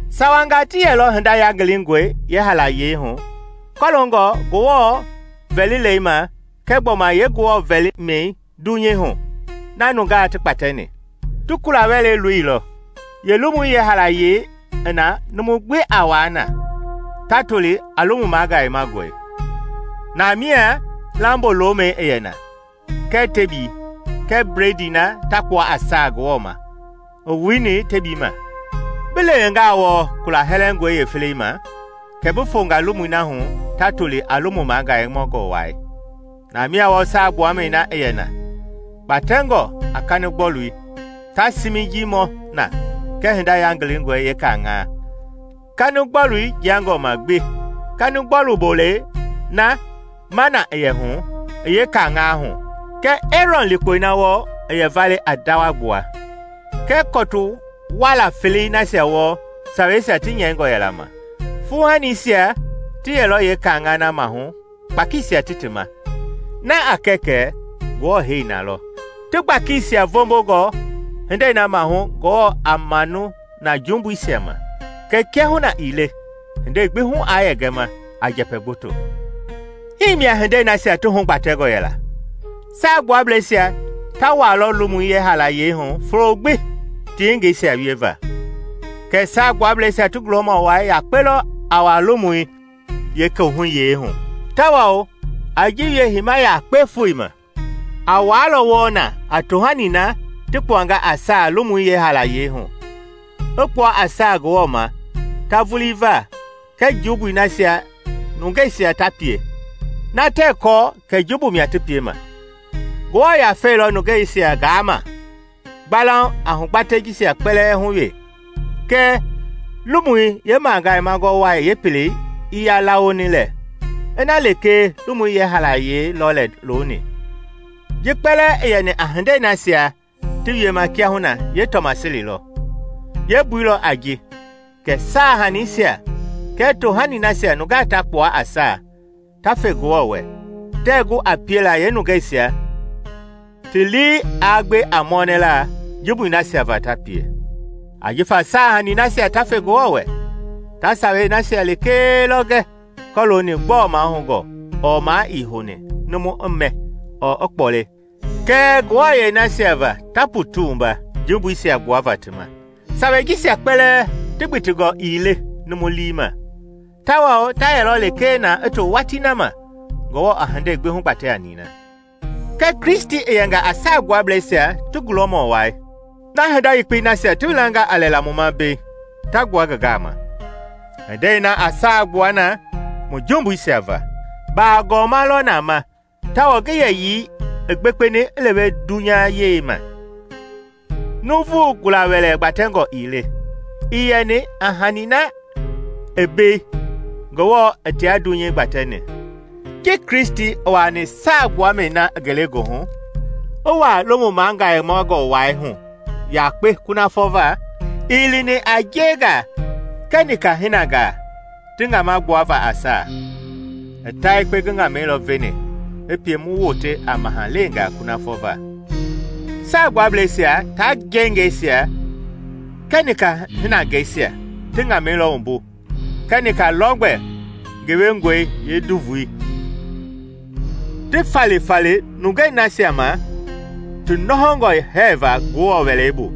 Sawangaa ti yɛlɔ hinda yangilingɔi yeehaalayei hu kɔloongɔ Ngewɔ vɛlile ma kɛɛ gbɔma yee-Ngewɔ vɛli mi dunyei hu na nungaa ti kpatɛni. Ti kula-wɛlei loilɔ, yeelomui yeehaalayei i na numu gbi a wuaa na, ta toli a Lomu Magayemangɔi. Na mia lambo-lomɛi i yɛ na, kɛɛ tebii, kɛɛ bledii na ta kpua a saa Ngewɔ ma i wuni yeetebii ma. Bi lewengaa wɔɔ kula hɛlɛngɔi yeefelei ma, kɛ bi fonga lomui na hu ta toli a Lomu Magayemangɔ Wai. Namia wɔɔ saagbuamɛi na i yɛ na, kpatɛngɔ a kanigbɔlui, ta siminjii mɔ na kɛɛ Hinda Yangilingɔi Yeekaŋaa, kanigbɔlui jiangɔ ma gbi, kanigbɔlu bolei na “mana” i yɛ hu i yeekaŋaa hu kɛɛ Eerɔn likpɔi na wɔɔ i yɛ vale a ndawa gbua kɛɛ kɔtu waala felei nasia wɔɔ saweisia ti nyɛingɔ yɛla ma. Fuuhanisia ti yɛlɔ yeekaŋaa mahu kpakiisia ti ti ma, na a kɛ kɛ Ngewɔ hei na lɔ, ti gbakisia vombongɔ hindei na maahu Ngewɔ a manu na jumbuisia ma. Kɛɛ kiahuna ii le hindei gbi hu aa yɛ gɛma a njɛpɛ gboto. Hii mia hindei nasia ti hugbatɛngɔ yɛla. Saagbuablɛisia ta wuaalɔ lomui yeehaalayei hu folo gbi ti yengeisia wieva; kɛ Saagbuablɛisia ti gulɔmɔ wai yakpe lɔ a wuaa lomui yeekohuyei hu, tawao a ji wie heima yakpe foo ma. A wuaalɔ wɔɔ na a tohani na ti kpuanga a saa lomui yeehaalayei hu, i kpua a saa Ngewɔ ma ta vulii va kɛɛ jumbui nasia nungeisia ta pie, na tɛɛ kɔɔ kɛ jumbu mia ti piema. Ngewɔ Yafei lɔ nungeisia gaama gbalauŋ a hugbatɛi jisia kpɛlɛɛ hu wee kɛ Lomui Yeemagayemangɔ Wai yeepelei ii yaa lawoni lɛ ina lekee lomu yeehaalayei lɔ lɛ looni. Ji kpɛlɛɛ i yɛni a hindei nasia ti wiema kiahuna yeetɔmaseli lɔ. Yeembui lɔ a ji kɛ saahaniisia kɛɛ tohani nasia nungaa ta kpua a saa ta fe Ngewɔ wɛ tɛɛ gu a piela yeenungeisia ti lii aa gbe a mɔnɛla jumbui nasia va ta pie, ajifa saahanii nasia ta fe Ngewɔ wɛ ta sawei nasia lekee lɔ gɛ kɔlooni gbɔɔ mahoungɔ ɔɔ maa ii houni numu i mɛ ɔɔ i kpɔle kɛɛ nguɛi nasia ta ti wua la jumbuisia gbuava ti ma. Sawei jisia kpɛlɛɛ ti gbitingɔ ii le numu lii ma tawao ta yɛlɔ lekee na i to watii na ma Ngewɔ a hindei gbi hugbatɛ a nina. Kɛɛ Kristi i yɛnga a Saagbuablɛisia ti gulɔmɔ wai na hinda yekpei nasia ti welanga a lɛla mu ma mbei ta gbua ngi gaama. Hindei na a saa gbua na mu jumbuisia va, baagɔma lɔ na ma tawao ngi yɛyii i gbekpeni i lewe dunyayei ma; nuuvu gula-wɛlɛ gbatɛngɔ ii le, ii yɛni a hani na i mbei Ngewɔ i tia dunyei gbatɛni. Ji Kristi i wuaani Saagbuamɛi na i ngelegoohu, i wuaa Lomu Magayemangɔ Wai hu yakpe kunafɔ va, ii lini a njengaa kɛɛ nika-hinangaa ti ŋama gbuava a saa; i ta yekpe ngi ŋamɛi lɔ veni i pie mu wote a mahaleengaa kunafɔ va. Saagbuablɛisia ta njengɛisia kɛɛ nika hinangɛisia ti ŋamɛi lɔ wumbu kɛɛ nika lɔgbɛ gewengɔi yeenduvui ti falifali nungei nasia ma ti nɔhɔngɔ hɛɛva Ngewɔ Wɛlei bu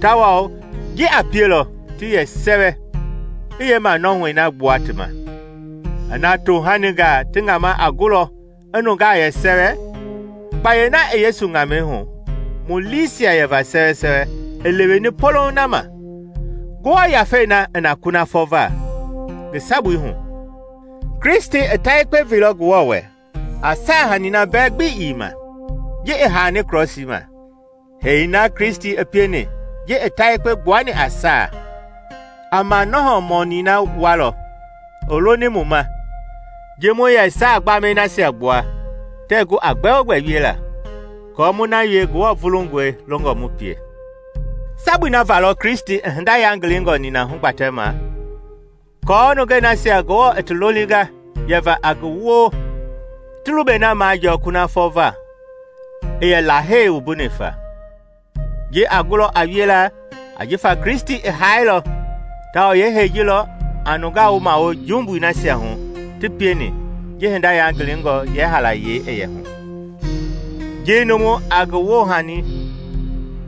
tawao ji a pielɔ ti yɛ sɛwɛ i yeemanɔhɔi na gbua ti ma. Ina tohaningaa ti ŋama a gulɔ i nungaa yɛ sɛwɛ, kpayei na i Yesu ŋamɛi hu mu liisia yɛva sɛwɛ i leweni polouŋ na ma. Ngewɔ Yafei na i na kunafɔ va ngi sabui hu, Kristi i ta yekpe veilɔ Ngewɔ wɛ a saahani na mbɛ gbi ii ma ji i haani krɔsii ma. Hee na Kristi i pieni ji i ta yekpe gbuani a saa, a manɔhɔ mɔni na wualɔ i loni mu ma ji mu yɛ saa gbamɛi nasia gbua tɛɛ gu a gbɛogbɛ wiela, aako mu na wie Ngewɔ vulungɔi longɔ mu pie. Sabui na va lɔ Kristi i hinda yangilingɔ nina hugbatɛma aako nungei nasia Ngewɔ i ti lolinga yɛva a ngi woo ti lubɛi na majɔɔ kunafɔ va i yɛ Lahei wumbuni fa. Ji a gulɔ a wiela ajifa Kristi i haailɔ tawao yeehei ji lɔ a nungaa wumawo jumbui nasia hu ti pieni ji hinda yangilingɔi yeehaalayei i yɛ hu. Ji numu a ngi woohani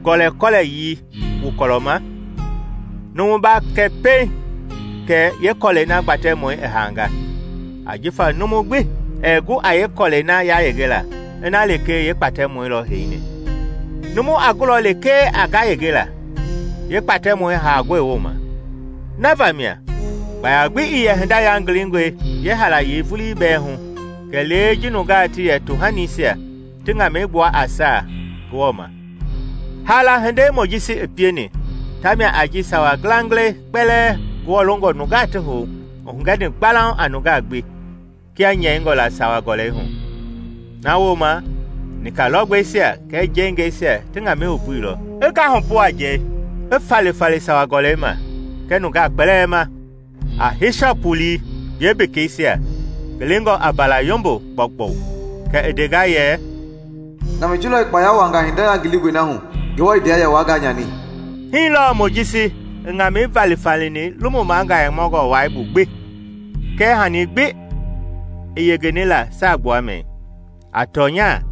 gɔlɛkɔlɛyii wu kɔlɔ ma, numu ba kɛ pɛiŋ kɛ yeekɔlɛi na gbatɛmɔi i haanga, ajifa numu gbi ɛɛ gu aa yeekɔlɛi na yayenge ina lekee yeekpatɛmɔi lɔ heini; numu a gulɔ lekee a ngayengela, yeekpatɛmɔi haangɔi wooma. Na vamia kpaya gbi ii yɛ hinda yangilingɔi yeehaalayei vulii bɛɛ hu kɛlee ji nungaa ti yɛ tohanisia ti ŋamɛi gbua a saa Ngewɔ ma. Haala hindei Mojisi i pieni tamia a ji sawa ngilangilɛi kpɛlɛɛ Ngewɔ longɔ nungaa ti hou i hugɛni gbalauŋ a nungaa gbi kia nyɛingɔ la Sawa-gɔlɛi hu. Na wooma i nika-lɔgbɛisia kɛɛ njengɛisia ti ŋamɛi wumbuilɔ, i ngahupu a njɛi, i falifali Sawa-gɔlɛi ma kɛɛ nungaa kpɛlɛɛ ma a hisɔp wulii yeembekeisia, ngilingɔ a mbaala-yombo gbɔugbɔi. Kɛ i ndenga yɛ, “Ŋamɛi ji lɔ i kpaya wuaanga hinda yangilingɔi na hu Ngewɔ i ndea yɛ waa nganyani.” Hii lɔ Mojisi i ŋamɛi valifalini Lomu Magayemangɔ Wai bu gbi kɛɛ hani gbi i yengeni la saagbuamɛi. A tɔnya,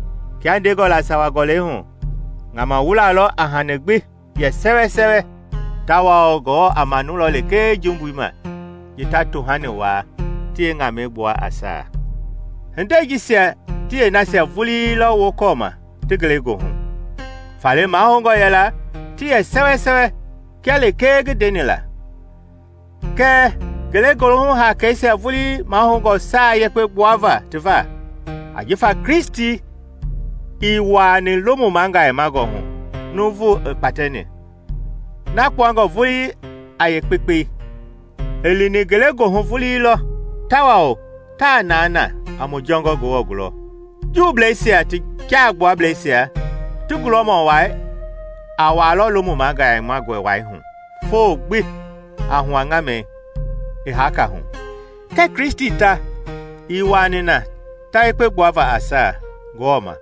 kia ndengɔ la Sawa-gɔlɛi hu, ŋama wula lɔ a hani gbi yɛ sɛwɛ tawao Ngewɔ a manulɔ lekee jumbui ma ji ta tohani waa ti yeeŋamɛi gbua a saa. Hinde jisia ti yeenasia vuii lɔ wokɔɔma ti ngelegoohu. Faale mahoungɔ yɛla ti yɛ sɛwɛsɛwɛ kia lekee ngi ndeni la. Kɛɛ ngelegoohu haakeisia vulii mahoungɔ saa yekpe gbuava ti va. Ajifa Kristi ii wuaani Lomu Magayemangɔ hu nuuvu i kpatɛni, na kpuangɔ vulii a yeekpekpei. I lini ngelegoohu vulii lɔ, tawao taa naa na a mu jɔngɔ Ngewɔ gulɔ. Juubleisia ti Jaabuablɛisia ti gulɔmɔ wai a wuaalɔ Lomu Magayemangɔi Wai hu foo gbi a hua ŋamɛi i haaka hu. Kɛɛ Kristi ta ii wuaani na ta yekpe gbuava a saa Ngewɔ ma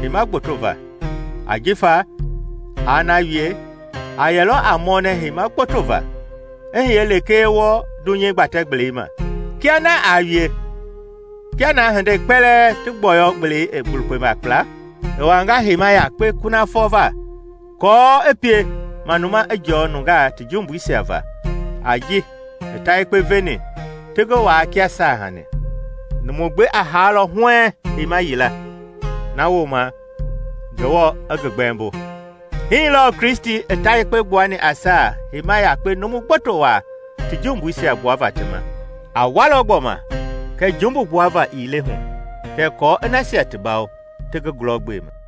heima gboto va, ajifa aa na wie, a yɛlɔ a mɔnɛ heima gboto va i hiye lekee wɔɔ dunyei gbatɛ-gbelei ma. Kia na aa wie, kia na hindei kpɛlɛɛ ti gbɔyɔ-gbelei i lukpenga kpla, i wanga heima yakpe kunafɔ va aako i pie manuma i jɔɔ nungaa ti jumbuisia va a ji i ta yekpe veni ti ngi waa kia saahanii. Numu gbi a haalɔ huɛɛŋ heima yila, na wooma Ngewɔ i ngi gbɛmbo. Hii lɔɔ Kristi i ta yekpe gbuani a saa heima yakpe numu gboto waa ti jumbuisia gbuava ti ma. A walɔ gbɔma kɛɛ jumbu gbuava ii le hu, kɛɛ kɔɔ i nasia ti bawo ti ngi gulɔgbema.